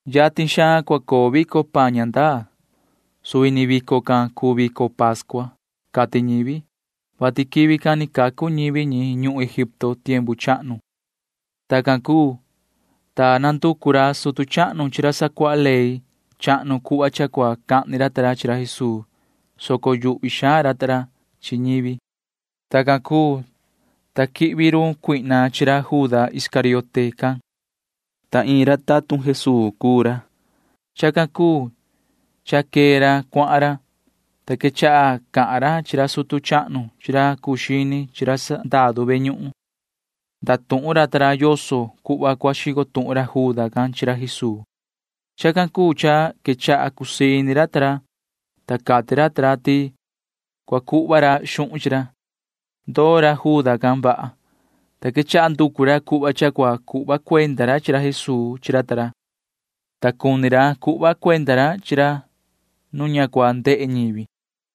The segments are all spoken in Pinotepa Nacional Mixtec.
Yatin xaan cua coo vico paan ña ndaa. Suvi ni vico can cuu vico pascua, cati ñivi, [vati quivi can ni cacu ñivi ñi ñuhun Egipto tiempu chahnu cuu chi]. Tacan cuu, ta nanducu ra sutu chahnu chi ra sacuaha ley chahnu cuhva cha cua cahni ra ta ra chi ra Jesuu, soco yuhvi xaan ra ta ra chi ñivi. Tacan cuu, ta quichi coo run Satanaa chi ra Juda Iscariote can, ta iin ra tatun Jesuu cuu ra. Chacan cuu cha quee ra cuahan ra, ta quechaha cahan ra chi ra sutu chahnu chi ra cuu xini chi ra sandaru ve ñuhun. Ndatuhun ra ta ra yoso cuhva cua xico tuhun ra Juda can chi ra Jesuu. Chacan cuu cha quechaha cusii ini ra ta ra, ta cati ra ta ra ti cua cuhva ra xuhun chi ra. Ndoo ra Juda can vaha, ta quechaha nducu ra cuhva cha cua cuhva cuenda ra chi ra Jesuu chi ra ta ra, ta cuni ra cuhva cuenda ra chi ra nu ña cua ndehe ñivi.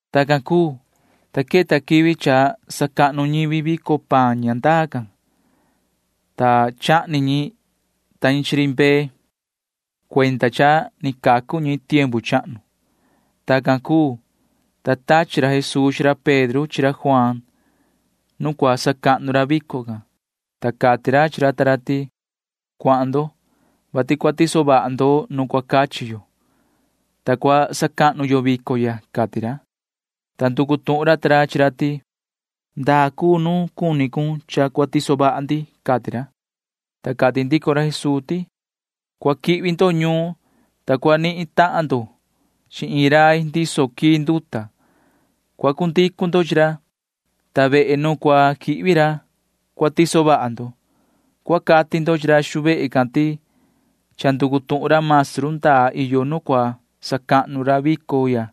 Tacan cuu, ta queta quivi cha sacahnu ñivi vico paan ña ndaa can, ta chahni ñi ta ñi iin ri mbee cuenda cha ni cacu ñivi ñi tiempu chahnu. Tacan cuu, ta tachi ra Jesuu chi ra Pedro chi ra Juaan [nu cua sacahnu ra vico can], ta cati ra chi ra ta ra ti: ―Cuahan ndo, vati cua tiso vaha ndo nu cua cachi yo, ta cua sacahnu yo vico ya ―cati ra. Ta nducu tuhun ra ta ra chi ra ti: ―¿Ndaa cuu nu cuni cun cha cua tiso vaha ndi? ―cati ra. Ta cati ndico ra Jesuu ti: ―Cua quihvi ndo ñuun, ta sa cua natahan ndo chi iin rai ndiso quii nduta. Cua cu ndicu ndo chi ra, ta vehe nu cua quihvi ra cua tiso vaha ndo. Cua cati ndo chi ra xu vehe can ti cha nducu tuhun ra maestru ndaa iyo nu cua sacahnu ra vico ya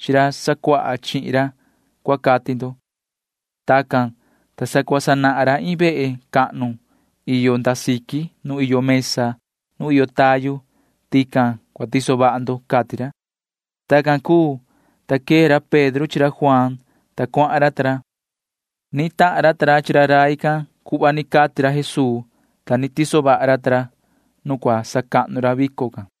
chi ra sacuaha chihin ra, cua cati ndo. Tacan, ta sa cua sanahan ra iin vehe cahnu iyo nda siqui nu iyo mesa nu iyo tayu. Tican cua tiso vaha ndo ―cati ra. Tacan cuu, ta quee ra Pedro chi ra Juaan, ta cuahan ra ta ra. Ni tahan ra ta ra cuhva cati ra Jesuu, ta ni tiso vaha ra ta ra nu cua sacahnu ra vico can.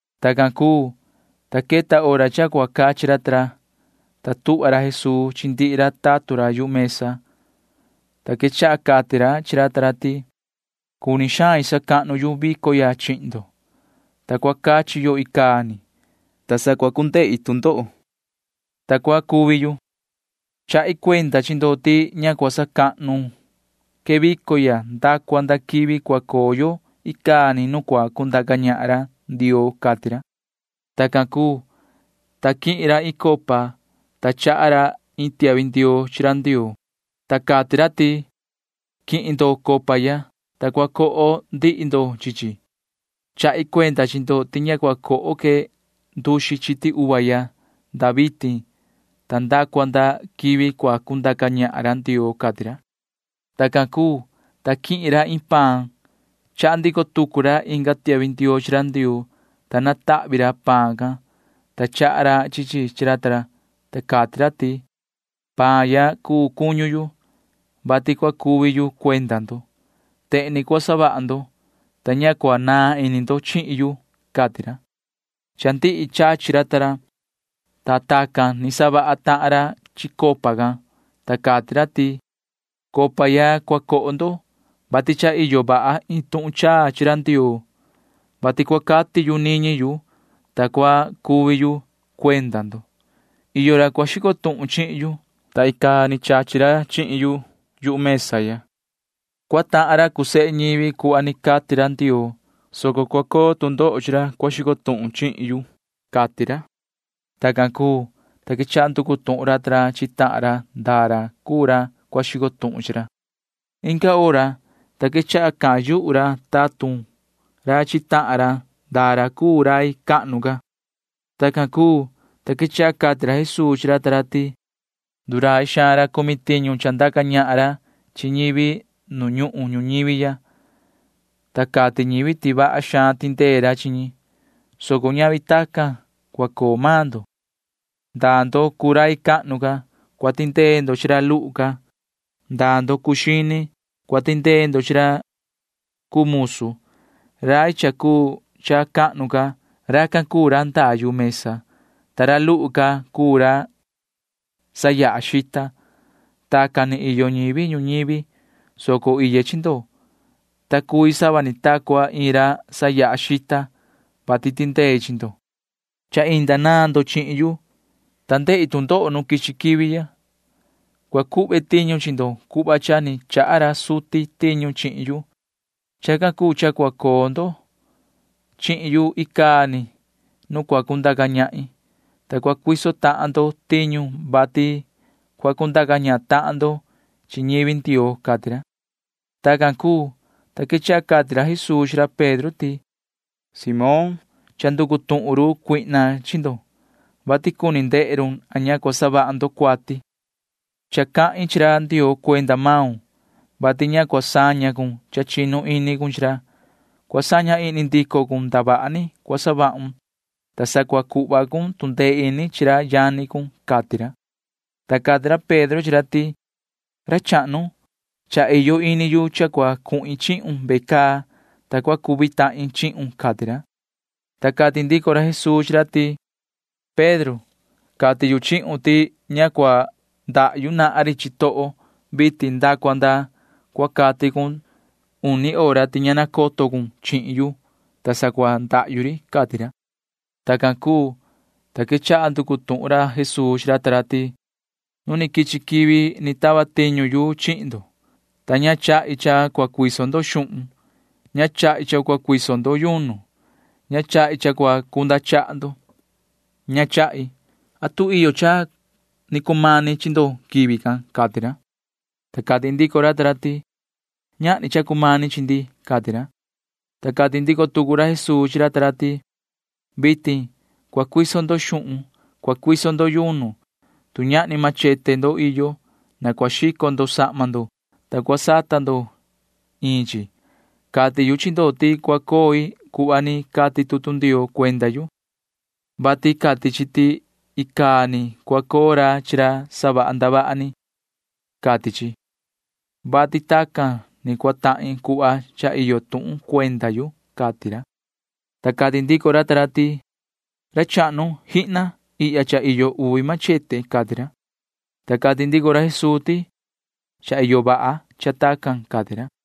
Tacan cuu, ta queta hora cha cua cachi ra ta ra, ta tuhva ra Jesuu chi ndihi ra tatun ra yu mesa, ta quechaha cati ra chi ra ta ra ti: ―Cuni xain sacahnu yu vico ya chihin ndo, ta cua cachi yo icaa ni, ta sa cua cu ndehi tu ndoho, ta cua cuvi yu. Chahi cuenda chi ndo ti ña cua sacahnu que vico ya nda cua nda quivi cua coo yo icaa ni nu cua cundaca ñahan ra Ndioo ―cati ra. Tacan cuu, ta quihin ra iin copa, ta chaha ra iin tiahvi ndioo chi ra Ndioo, ta cati ra ti: ―Quihin ndo copa ya, ta cua coho ndihi ndo chi chi. Chahi cuenda chi ndo ti ña cua coho que nduxi chiti uva ya nda vitin ta nda cua nda quivi cua cundaca ñahan ra Ndioo ―cati ra. Tacan cuu, ta quihin ra iin paan. Chaha ndico tucu ra inga tiahvi ndioo chi ra Ndioo, ta natahvi ra paan can, ta chaha ra chi chi chi ra ta ra, ta cati ra ti: ―Paan ya cuu cuñu yu, vati cua cuvi yu cuenda ndo. Tehen ni cua savaha ndo, ta ña cua naan ini ndo chihin yu ―cati ra. Cha ndihi chachi ra ta ra, ta tacan ni savaha tahan ra chi copa can, ta cati ra ti: ―Copa ya cua coho ndo, vati cha iyo vaha iin tuhun chaa chi ra Ndioo, vati cua cati yu niñi yu, ta cua cuvi yu cuenda ndo. ’Iyo ra cua xico tuhun chihin yu, ta icaa ni chachi ra chihin yu mesa ya. Cua tahan ra cuu sehe ñivi cuhva ni cati ra Ndioo, soco cua coo tu ndoho chi ra cua xico tuhun chihin yu ―cati ra. Tacan cuu, ta quechaha nducu tuhun ra ta ra chi tahan ra ndaa ra cuu ra cua xico tuhun chi ra. Inga hora, ta quechaha cahan yuhu ra tatun ra chi tahan ra ndaa ra cuu rai cahnu ca. Tacan cuu, ta quechaha cati ra Jesuu chi ra ta ra ti: ―Ndurai xaan ra cumi tiñu cha ndaca ñahan ra chi ñivi nu ñuhun ñuñivi ya, ta cati ñivi ti vaha xaan tindee ra chi ñi, soco ñavi tacan cua coo maan ndo. Ndaa ndo cuu rai cahnu ca―cua tindee ndo chi ra luhu ca. Ndaa ndo cuu xini―cua tindee ndo chi ra cuu musu. Rai cha cuu cha cahnu ca―racan cuu ra ndaa yu mesa, ta ra luhu ca cuu ra sayaha xita. Tacan ni iyo ñivi ñuñivi, soco iye chi ndo, ta cui sava ni ta cua iin ra sayaha xita, [vati tindei chi ndo]. ’Cha inda naan ndo chihin yu, ta ndehi tu ndoho nu quichi quivi ya. Cua cuhve tiñu chi ndo cuhva cha ni chaha ra suti tiñu chihin yu. Chacan cuu cha cua coo ndo chihin yu icaa ni nu cua cundaca ñahin, ta cua cuiso tahan ndo tiñu, vati cua cundaca ñahan tahan ndo chi ñivi Ndioo ―cati ra. Tacan cuu, ta quechaha cati ra Jesuu chi ra Pedro ti: ―Moon, cha nducu tuhun run Satanaa chi ndo, vati cuni ndehe run a ña cua savaha ndo cuati. Cha cahin chi ra Ndioo cuenda maun, vati ña cua saña cun cha chinu ini cun chi ra. Cua saña ihni ndico cun ndavaha ni cua savahun, ta sa cua cuhva cun tu ndee ini chi ra yani cun ―cati ra. Ta cati ra Pedro chi ra ti: ―Ra chahnu, cha iyo ini yu cha cua cuhin chihun ve caa, ta cua cuvi tahin chihun ―cati ra. Ta cati ndico ra Jesuu chi ra ti: ―Pedro, cati yu chihun ti ña cua ndahyu nahan ri chitoho vitin nda cua nda cua cati cun uni hora ti ña nacoto cun chihin yu, ta sa cua ndahyu ri ―cati ra. Tacan cuu, ta quechaha nducu tuhun ra Jesuu chi ra ta ra ti: ―Nu ni quichi quivi ni tava tiñu yu chihin ndo, ta ña chahi cha cua cuiso ndo xuhun. Ña chahi cha cua cuiso ndo yunu. Ña chahi cha cua cunda chaha ndo. Ña chahi. ¿Atu iyo cha ni cumani chi ndo quivi can? ―cati ra. Ta cati ndico ra ta ra ti: ―Ñahni cha ni cumani chi ndi ―cati ra. Ta cati ndico tucu ra Jesuu chi ra ta ra ti: ―Vitin cua cuiso ndo xuhun. Cua cuiso ndo yunu. Tu ñahni machete ndo iyo, na cua xico ndo sahma ndo, ta cua sata ndo iin chi. Cati yu chi ndo ti cua coi cuhva ni cati tutu Ndioo cuenda yu, vati cati chi ti icaa ni cua coo ra chi ra savaha ndavaha ni, cati chi, vati tacan ni cua tahin cuhva cha iyo tuhun cuenda yu ―cati ra. Ta cati ndico ra ta ra ti: ―Ra chahnu, ¡jihna! Ihya cha iyo uvi machete ―cati ra. Ta cati ndico ra Jesuu ti: ―Cha iyo vaha cha tacan ―cati ra.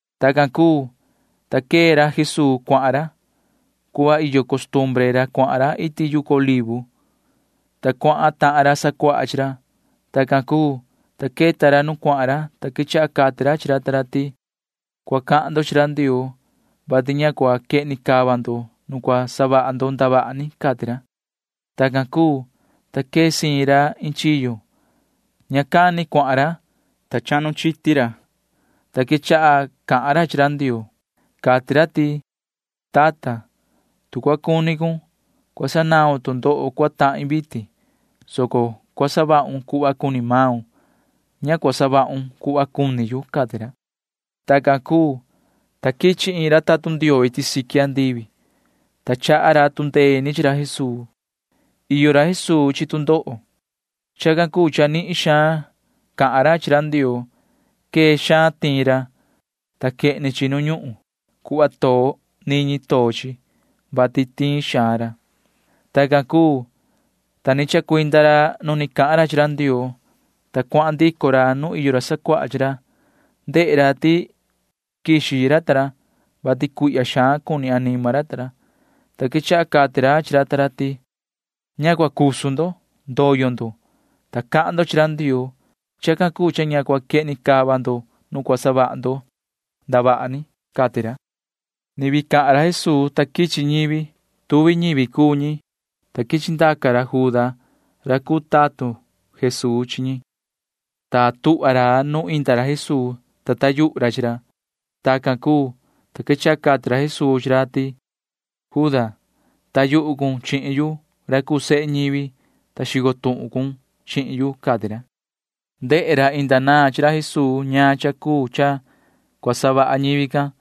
Tacan cuu, ta quee ra Jesuu cuahan ra. Cuhva iyo costumbre ra cuahan ra iti yucu Olivo, ta cuahan tahan ra sacuaha chi ra. Tacan cuu, ta queta ra nu cuahan ra, ta quechaha cati ra chi ra ta ra ti: ―Cua cahan ndo chi ra Ndioo, vati ña cua quehni cava ndo nu cua savaha ndo ndavaha ni ―cati ra. Tacan cuu, ta quee siin ra iin chiyo. Ña cani cuahan ra, ta chahnu chiti ra, ta quechaha cahan ra chi ra Ndioo. Cati ra ti: ―Tata, tu cua cuni cun, cua sanaun tu ndoho cua tahin vitin, soco cua savahun cuhva cuni maun. Ña cua savahun cuhva cuni yu ―cati ra. Tacan cuu, ta quichi iin ra tatun Ndioo iti siqui andivi, ta chaha ra tu ndee ini chi ra Jesuu. Iyo ra Jesuu chi tu ndoho. Chacan cuu cha nihin xaan ca cahan ra chi ra Ndioo. Quee xaan tiin ra, ta quehni chi nu ñuhun. Cuhva too niñi too chi, vati tiin xaan ra. Tacan cuu, ta ni chacuinda ra nu ni cahan ra chi ra Ndioo, ta cuahan ndico ra nu iyo ra sacuaha chi ra. Ndehe ra ti quixi ra ta ra, vati cuihya xaan cuni anima ra ta ra, ta quechaha cati ra chi ra ta ra ti: ―Ña cua cusu ndo. Ndoyo ndo, ta cahan ndo chi ra Ndioo. Chacan cuu cha ña cua quehni cava ndo nu cua savaha ndo ndavaha ni. Ni vii cahan ra Jesuu, ta quichi ñivi. Tuvi ñivi cuu ñi, ta quichi ndaca ra Juda ra cuu tatun Jesuu chi ñi, ta tuhva ra nu inda ra Jesuu, ta taa yuhu ra chi ra. Tacan cuu, ta quechaha cati ra Jesuu chi ra ti: ―Juda, taa yuhu cun chihin yu ra cuu sehe ñivi, ta xico tuhun cun chihin yu ―cati ra. Ndehe ra inda naan chi ra Jesuu ñaan cha cuu cha cua savaha ñivi can,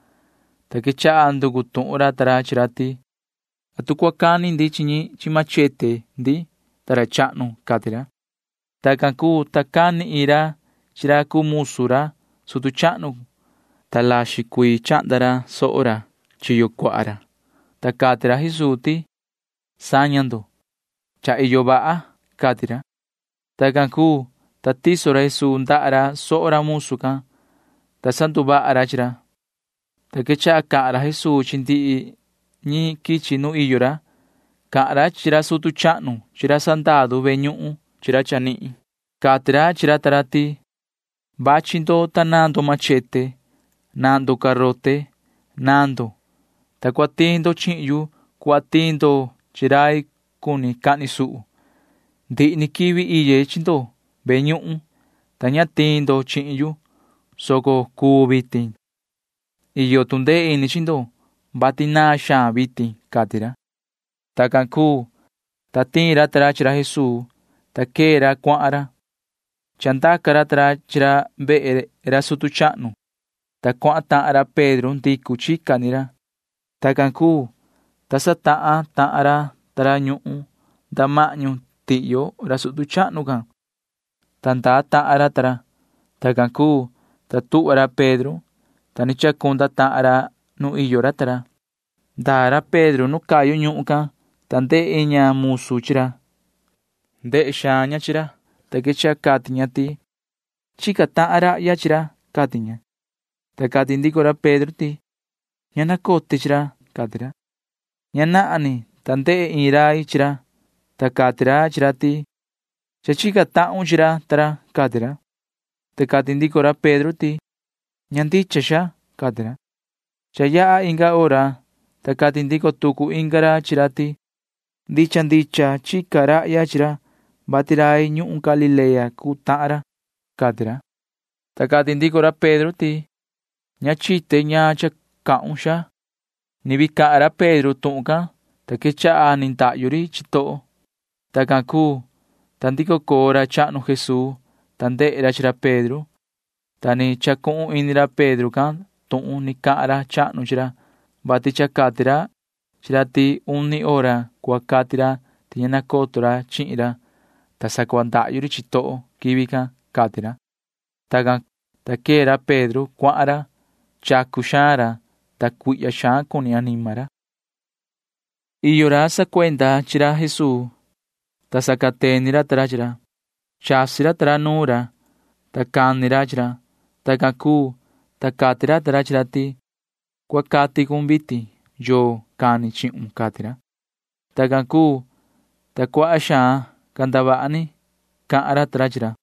ta quechaha nducu tuhun ra ta ra chi ra ti: ―¿Atu cua cani ndi chi ñi chi machete ndi, ta ra chahnu? ―cati ra. Tacan cuu, ta cani iin ra chi ra cuu musu ra sutu chahnu, ta laxin cuii chahnda ra soho chiyo cuaha ra, ta cati ra Jesuu ti: ―Saña ndo. Cha iyo vaha ―cati ra. Tacan cuu, ta tiso ra Jesuu ndaha ra soho ra musu can, ta sanduvaha ra chi ra, ta quechaha cahan ra Jesuu chi ndihi ñi quichi nu iyo ra. Cahan ra chi ra sutu chahnu chi ra sandaru ve ñuhun chi ra chanihin ta ra. Cati ra chi ra ta ra ti: ―Vachi ndo, ta naan ndo machete. Naan ndo garote. Naan ndo, ta cua tiin ndo chihin yu cuhva tiin ndo chi rai cuni cahni suhu. Ndihi ni quivi iye chi ndo ve ñuhun, ta ña tiin ndo chihin yu, soco cuu vitin. Iyo tu ndee ini chi ndo, vati naan xaan vitin ―cati ra. Tacan cuu, ta tiin ra ta ra chi ra Jesuu, ta quee ra cuahan ra. Chandaca ra ta ra chi ra vehe ra sutu chahnu, ta cuahan tahan ra Pedro ndicu chica ni ra. Tacan cuu, ta satahan tahan ra ta ra ñuhun nda mahñu tihyo ra sutu chahnu can, ta ndaa tahan ra ta ra. Tacan cuu, [ta tuhva ra Pedro,] ta ni chacunda tahan ra nu iyo ra ta ra. Ndaa ra Pedro nu cayu ñuhun can, ta ndehe iin ña musu chi ra. Nihin xaan ndehe ña chi ra, ta quechaha cati ña ti: ―Chica tahan rahya chi ra ―cati ña. Ta cati ndico ra Pedro ti: ―Ña nacote chi ra, sihi ―cati ra. Ña nahan, ta ndehe iin rai chi ra, ta cati ra chi ra ti: ―Cha chica tahun chi ra ta ra ―cati ra. Ta cati ndico ra Pedro ti: ―Ña ndicha, xaa ―cati ra. Cha yaha inga hora, ta cati ndico tucu inga ra chi ra ti: ―Ndicha ndicha chica rahya chi ra, vati rai ñuhun Galilea cuu tahan ra ―cati ra. Ta cati ndico ra Pedro ti: ―Ña chite ñaan cha cahun, xaa. Ni vii cahan ra Pedro tuhun can, ta quechaha ni ndahyu ri chitoho. Tacan cuu, ta ndico coo ra chahnu Jesuu, ta ndehe ra chi ra Pedro, ta ni chacuhun ini ra Pedro can tuhun ni cahan ra chahnu chi ra, vati cha cati ra chi ra ti uni hora cua cati ra ti ña nacoto ra chihin ra, ta sa cua ndahyu ri chitoho quivi can, cati ra. Tacan, ta quee ra Pedro cuahan ra. Chacu xaan ra, ta cuihya xaan cuni anima ra. Iyo ra sacuenda chi ra Jesuu, ta sacateni ra ta ra chi ra. Chasi ra ta ra nuun ra, ta cani ra chi ra. Tacan cuu, ta cati ra ta ra chi ra ti: ―Cua cati cun vitin. ¿Yoo cani chihun? ―cati ra. Tacan cuu, ta cuaha xaan ca ndavaha ni cahan ra ta ra chi ra.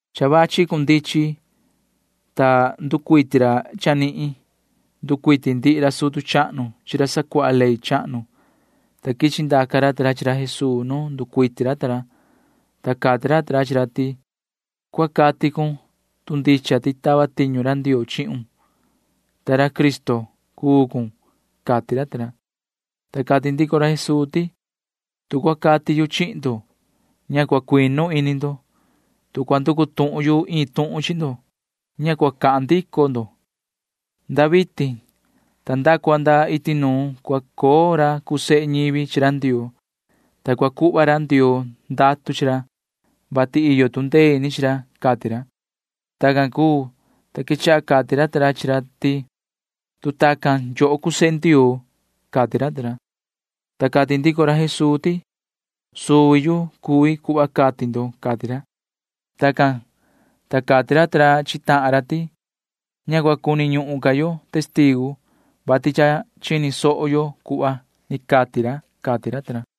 Cha vachi cundichin, ta nducuiti ra chanihin. Nducuiti ndihi ra sutu chahnu chi ra sacuaha ley chahnu, ta quichi ndaca ra ta ra chi ra Jesuu nu nducuiti ra ta ra, ta cati ra ta ra chi ra ti: ―Cua cati cun, tu ndicha ti tava tiñu ra Ndioo chihun, ta ra Cristo cuun ―cati ra ta ra. Ta cati ndico ra Jesuu ti: ―Tu cua cati yu chihin ndo, ña cua cuinu ini ndo. Tu cua nducu tuhun yu iin tuhun chi ndo, ña cua cahan ndico ndo. Nda vitin ta nda cua nda iti nuun cua coo ra cuu sehe ñivi chi ra Ndioo, ta cua cuhva ra Ndioo ndatu chi ra, vati iyo tu ndee ini chi ra ―cati ra. Tacan cuu, ta quechaha cati ra ta ra chi ra ti: ―Tu tacan, yoho cuu sehe Ndioo ―cati ra ta ra. Ta cati ndico ra Jesuu ti: ―Suvi yu cui cuhva cati ndo ―cati ra. Tacan, ta cati ra ta ra chi tahan ra ti: ―Ña cua cuni ñuhun ca yo testigu, vati cha chini soho yo cuhva ni cati ra ―cati ra ta ra.